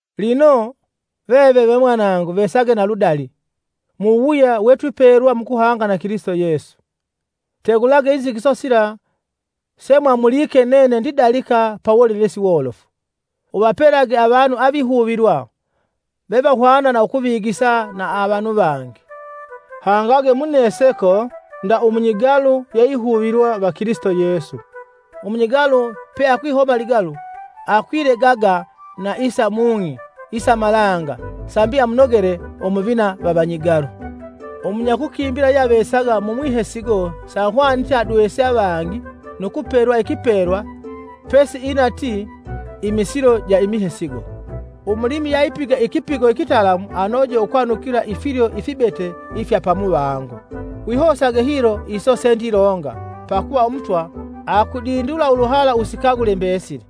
Lino, veve ve mwanangu vesage na ludali, muwuwuya wetwipelwa mukuhanga na Kilisito Yesu. Tegulage inzigiso sila semwamulike nene ndilalika pa wolelesi wolofu, uvapelage avanu avihuvilwa, vevahwana na ukuvigisa na avanu vangi. Hangage muneseko nda umunyigalu yeihuvilwa va Kilisito Yesu. Umunyigalu peakwihoma ligalu akwilegaga na isa mung'i isa malanga sambi amunogele umuvina va vanyigalu. Umunyakukimbila yeyeavesaga mumwihesigo sahwanite adwese avangi nu kupelwa ikipelwa pesiinatii imisilo ja imihesigo. Umulimi yeapigite ikipigo ikitalamu anoje ukwanukila ifilyo ifibete ifya pamuvango. Wihosage hilo iso sendilonga pakuva Umutwa akudindula uluhala usikagule mbesili.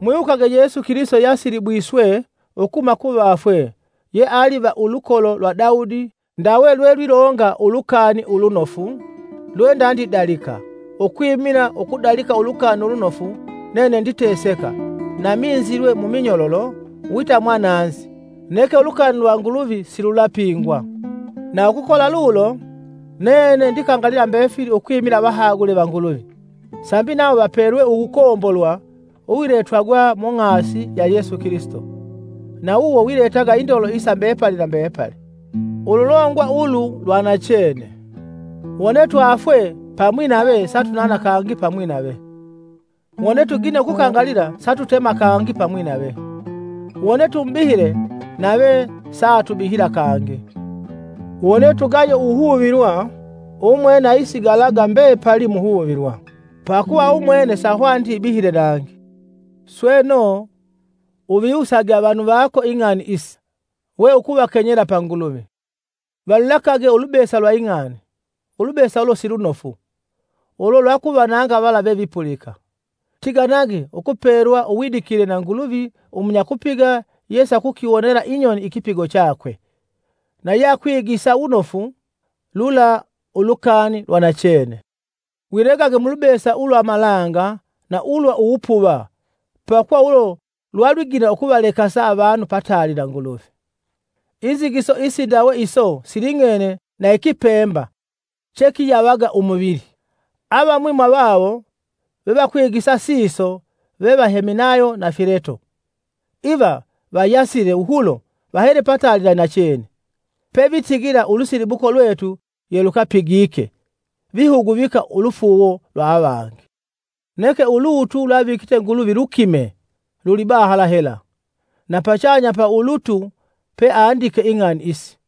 Mwiwukage Yesu Kilisito yeasilibwiswe ukuhuma kuvafwe yeali va ulukolo lwa Dawudi ndawe lwelwilonga Ulukani Ulunofu lwendandidalika ukwimila ukudalika Ulukani Ulunofu nene nditeseka na minzilwe muminyololo wita mwananzi neke ulukani lwa Nguluvi sisalupigwa. Na ukukola lulo, nene ndikangalila mbefili ukwimila avahagule va Nguluvi, sambi nawo vapelwe uwukombolwa uwiletwagwa mung'asi ya Yesu Kilisito, na wuwo wiletaga indolo isa mbepali na mbepali. Ululongwa ulu lwa nachene: Wone twafwe pamwi nave, satunana kangi pamwi nave. Wone tugine ukukangalila, satutema kangi pamwi nave. Wone tumubihile, nave saatubihila kangi; Wone tugaye uwuhuvilwa, umwene aisigalaga mbepali muhuvilwa, pakuva umwene sahwaniti ibihile nangi. Sweno, uviwusage avanu vako ing'ani isi, weukuvakenyela pa Nguluvi, valulekage ulubesa lwa ing'ani, ulubesa ulo silunofu, ulo lwakuvananga vala vevipulika. Tiganage ukupelwa uwidikile na Nguluvi umunyakupiga yesakukiwonela inyoni ikipigo chakwe, na yeakwigisa wunofu lula ulukani lwa nachene. Wilegage mulubesa ulwa malanga na ulwa uwupuva pakuva ulo lwalwigina ukuvalekasa avanu pataali na Nguluvi. Inzigiso isindawe iso siling'ene na ikipemba chekiyavaga umuvili. Avamwi mwavawo vevakwigisa siso veva Heminayo na Fileto. Iva vayasile wuhulo vahele pataali na inachene, pevitigila ulusilibuko lwetu yelukelupigike vihuguvika ulufuuwo lwa avangi. Neke ulutu lweavikite Nguluvi lukimee lulibahala hela, na pachanya pa ulutu peandike ing'ani isi;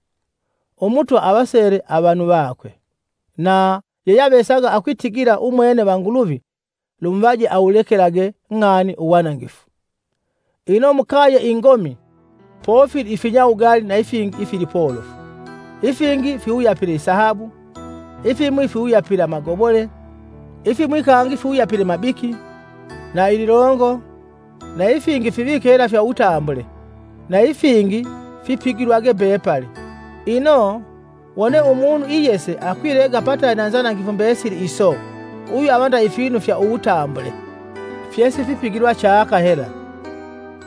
“Umutwa avasele avanu vakwe,” na “Yeyeavesaga akwitigila umwene va Nguluvi, lumuvaje awulekelage ng'ani uwanangifu.” Ino mukaye ingomi, pofili ifinyawugali na ifingi ifilipolofu, ifingi fiwuyapile isahabu, ifimwi fiwuyapile amagobole, ifimwi kangi fiwuyapile mabiki, na ililongo, na ifingi fivike hela fya wutambule na ifingi fipigilwage mbepali. Ino, wone umunu iyese akwilega pataali na inzanangifu mbesili iso, uyu ava nda ifinu ifya uwutambule fyesifipigilwa chaka hela,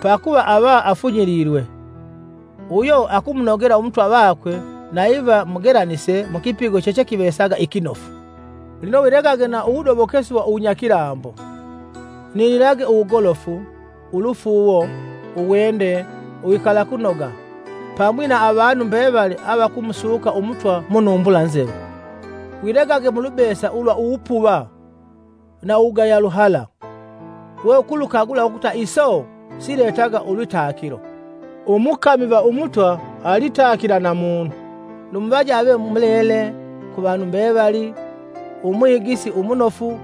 pakuva ava afunyililwe, uyo akumunogela umutwa vakwe na iva mugelanise mukipigo chechekivesaga ikinofu. Lino wilegage na uwudobokesi wa uwunyakilambo, ninilage uwugolofu, ulufuuwo, uwende, uwikalakunoga, pamwi na avanu mbevali avakumusuka umutwa munumbula nzelu. Wilegage mulubesa ulwa uwupuva na ukugaya luhala; weukulukagula ukuta iso siletaga ulwitakilo. Umukami va Umutwa alitakila na munu. Lumuvaje ave mulele ku vanu mbevali, umwigisi umunofu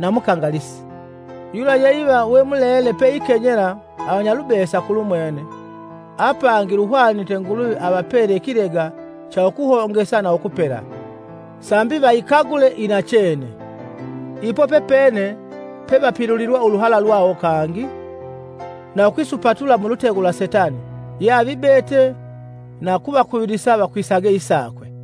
na mukangalisi; yula ye iva we mulele peikenyela avanyalubesa kulumwene, apangi luhwanite Nguluvi avapele ikilega cha ukuhongesa na ukupela, sambi vayikagule inachene. Ipo pepene pevapilulilwa uluhala lwawo kangi, na ukwisupatula mulutego lwa Setani yeavibete na kuvakuvilisa vakwisaga isakwe.